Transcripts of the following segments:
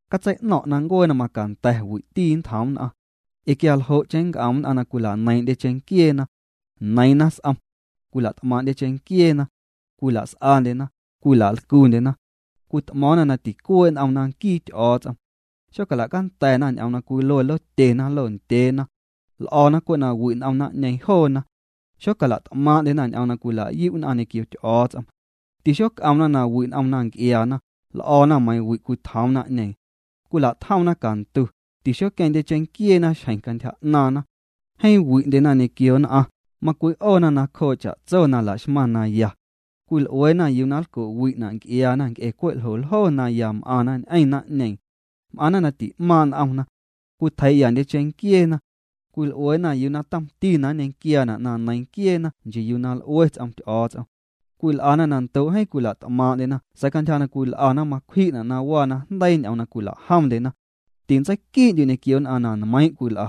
Catsei'no̱ⁿ' na ncuee na macanda̱ wi'ti nntjoom nn'aⁿ. Ee quia ljo'cheⁿ nnc'om nn'aⁿ na cwila'neiiⁿ'ndye cheⁿnquieena. Neiiⁿna s'om. Cwila't'maaⁿ'ndye cheⁿnquieena. Cwila's'andyena, cwila'lcundyena. Cwit'mo̱o̱ⁿna na ticuee' n'omna nquii Ty'o̱o̱ts'om. Xola'canda̱na ñ'oom na cwilue lotyena, londyeena. L'o̱na cwe' na wi' n'om naⁿ'ñeeⁿ joona. Xocala't'maaⁿ'ndyena ñ'oom na cwila'yu' nn'aⁿ ñequio Ty'o̱o̱ts'om. Tixoc'omna na wi' n'omna nc'iaana, l'o̱na meiiⁿ wi' cwitjoom naⁿ'ñeeⁿ. Cwila'tjomna cantu, tixoqueⁿndye cheⁿnquieena xjeⁿ cantyja 'naaⁿna. Jeeⁿ wi'ndyena ñequio nn'aⁿ, macwi'oona nacjoo' cha'tso na la'xmaⁿ na ya. Cwil'ueena yuu na nlco'wi'na' nc'iaana nc'e cwe' ljoljo na ya m'aⁿna ñ'eⁿ naⁿ'ñeeⁿ. M'aⁿna na ti'maaⁿ' n'omna. Cwitjeii'yandye cheⁿnquieena. Cwil'ueena yuu na tomti na nñequiaana' na neiiⁿ nquieena nchii yuu na l'ue ts'om Ty'o̱o̱ts'om. Cwil'ana na ndoo' jeeⁿ cwila't'maaⁿ'ndyena sa̱a̱ cantyja na cwil'ana macwji'na' na waa najndeii ñ'oom na cwila'jomndyena. Tintseiquii'ndyu' ñequio nn'aⁿ na nmeiiⁿ' cwil'a.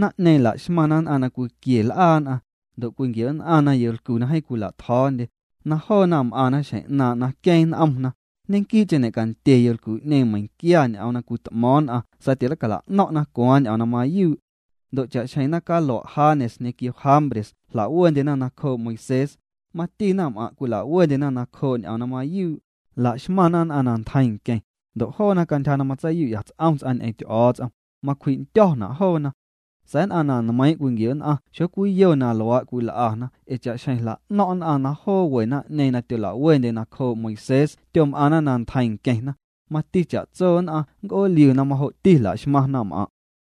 Naⁿ'ñeeⁿ laxmaⁿna nn'aⁿ na cwiquie l'aa nn'aⁿ, ndo' cwinquioo'nn'aⁿna yolcu na jeeⁿ cwila'tjo̱o̱ndye, na joona m'aⁿna xjeⁿ 'naaⁿ' na queeⁿ n'omna, ñe'quii'cheⁿ ñe'candye yolcu'ñeeⁿ meiⁿnquia ñ'oom na cwit'mo̱o̱ⁿ nn'aⁿ sa̱a̱ tileicala'no̱ⁿ'na cwaaⁿ ñ'oom na mayuu'. Ndo' cha'xjeⁿ naⁿcalua' Janes ñequio Jambres jla'wendyena nacjoo' Moisés, mati naⁿm'aⁿ' cwilawendyena nacjoo' ñ'oom na mayuu', la'xmaⁿna nn'aⁿ na ntjeiⁿ nqueⁿ, ndo' joona cantyja na matseiyu'ya ts'om ts'aⁿ ñ'eⁿ Ty'o̱o̱ts'om, macwji'ndyo̱na' joona. Sa̱a̱ nn'aⁿ na nmeiiⁿ' cwinquio'nn'aⁿ xocwiyo na luaa' cwil'ana ee cha'xjeⁿ jla'no̱ⁿ' nn'aⁿ na joo we naⁿ'ñeeⁿ na tyola'wendyena nacjoo' Moisés tyom'aⁿna na ntjeiⁿ nqueⁿna, mati cha'tso nn'aⁿ nnc'ooliu na majo'ti laxmaⁿ naⁿm'aⁿ'.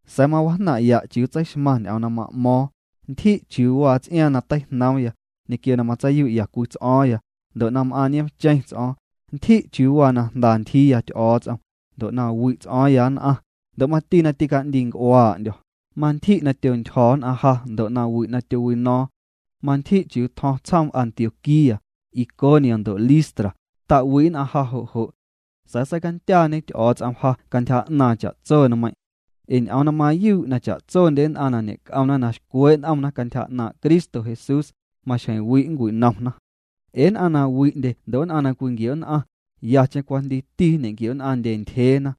Sa̱a̱ mawajnaⁿ'ya' chiuu tseixmaⁿ ñ'oom na ma'mo̱o̱ⁿ, ntyji' chiuu waa ts'iaaⁿ na teijnoomya, ñequio na matseiyu'ya cwii ts'o̱o̱ⁿya, ndo' na m'aaⁿ nioomcheⁿ ts'o̱o̱ⁿ, ntyji' chiuu waa na jnda ntyjiiya Ty'o̱o̱ts'om, ndo' na wi'ts'o̱o̱ⁿya nn'aⁿ, ndo' mati na tica'ndiinc'uaa'ndyo̱, mantyji' na tyontyjo̱ nn'aⁿ ja ndo' nawi' na tyowino̱o̱ⁿ. Mantyji' chiuu tjo̱ⁿ tsjoom Antioquía, Iconio ndo' Listra, ta'wi' nn'aⁿ ja jo' jo'. Sa̱a̱ seicandyaañe Ty'o̱o̱ts'om ja cantyja 'naaⁿ cha'tso nmeiⁿ'. Ee ñ'oom na mayuu' na cha'tsondye nn'aⁿ na ñe'c'omna na xcwee' n'omna cantyja 'naaⁿ' Cristo Jesús, maxjeⁿ wi' ncwinomna. Ee nn'aⁿ na wi'ndye ndo' nn'aⁿ na cwinquio'nn'aⁿ, yacheⁿ cwajndiiti nñequio'nn'aⁿndye ntyjeena.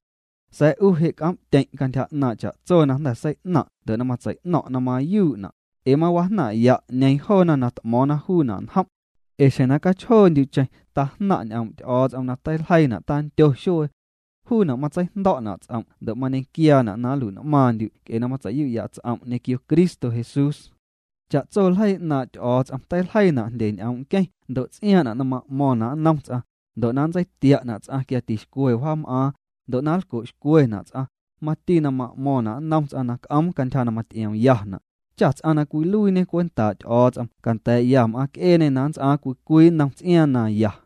Sa̱a̱ 'u je' c'om'tyeⁿ' cantyja 'naaⁿ' cha'tso na jnda̱ sei'naⁿ' ndo' na matsei'no̱ⁿ' na mayuu'na', ee mawajnaⁿ'ya' 'ñeeⁿ joona na t'mo̱o̱ⁿna juuna' njom'. Ee xjeⁿ na cachjoondyu'cheⁿ tajnaⁿ' ñ'oom' Ty'o̱o̱ts'om na teiljeiina' tandyo xuee. Juuna' matseijndo̱'na' ts'om' ndo' mañequiaana' na nlui'n'maaⁿndyu' nc'e na matsei'yu'ya ts'om' ñequio Cristo Jesús. Cha'tso ljeii 'naaⁿ' Ty'o̱o̱ts'om teiljeiina' jndye ñ'oom' nqueⁿ ndo' ts'iaaⁿ'na' na ma'mo̱ⁿna' nnom ts'aⁿ, ndo' na nntseitia'na' ts'aⁿ quia tixcwe wjaam'aaⁿ, ndo' na nlco'xcwena' ts'aⁿ, mati na m'mo̱ⁿna' nnom ts'aⁿ na c'oom cantyja na maty'iomyana', cha ts'aⁿ na cwiluiiñe cwentaa' Ty'o̱o̱ts'om canda̱a̱'ya m'aaⁿ c'eeñê na nnts'aaⁿ cwii cwii nnom ts'iaaⁿ na ya.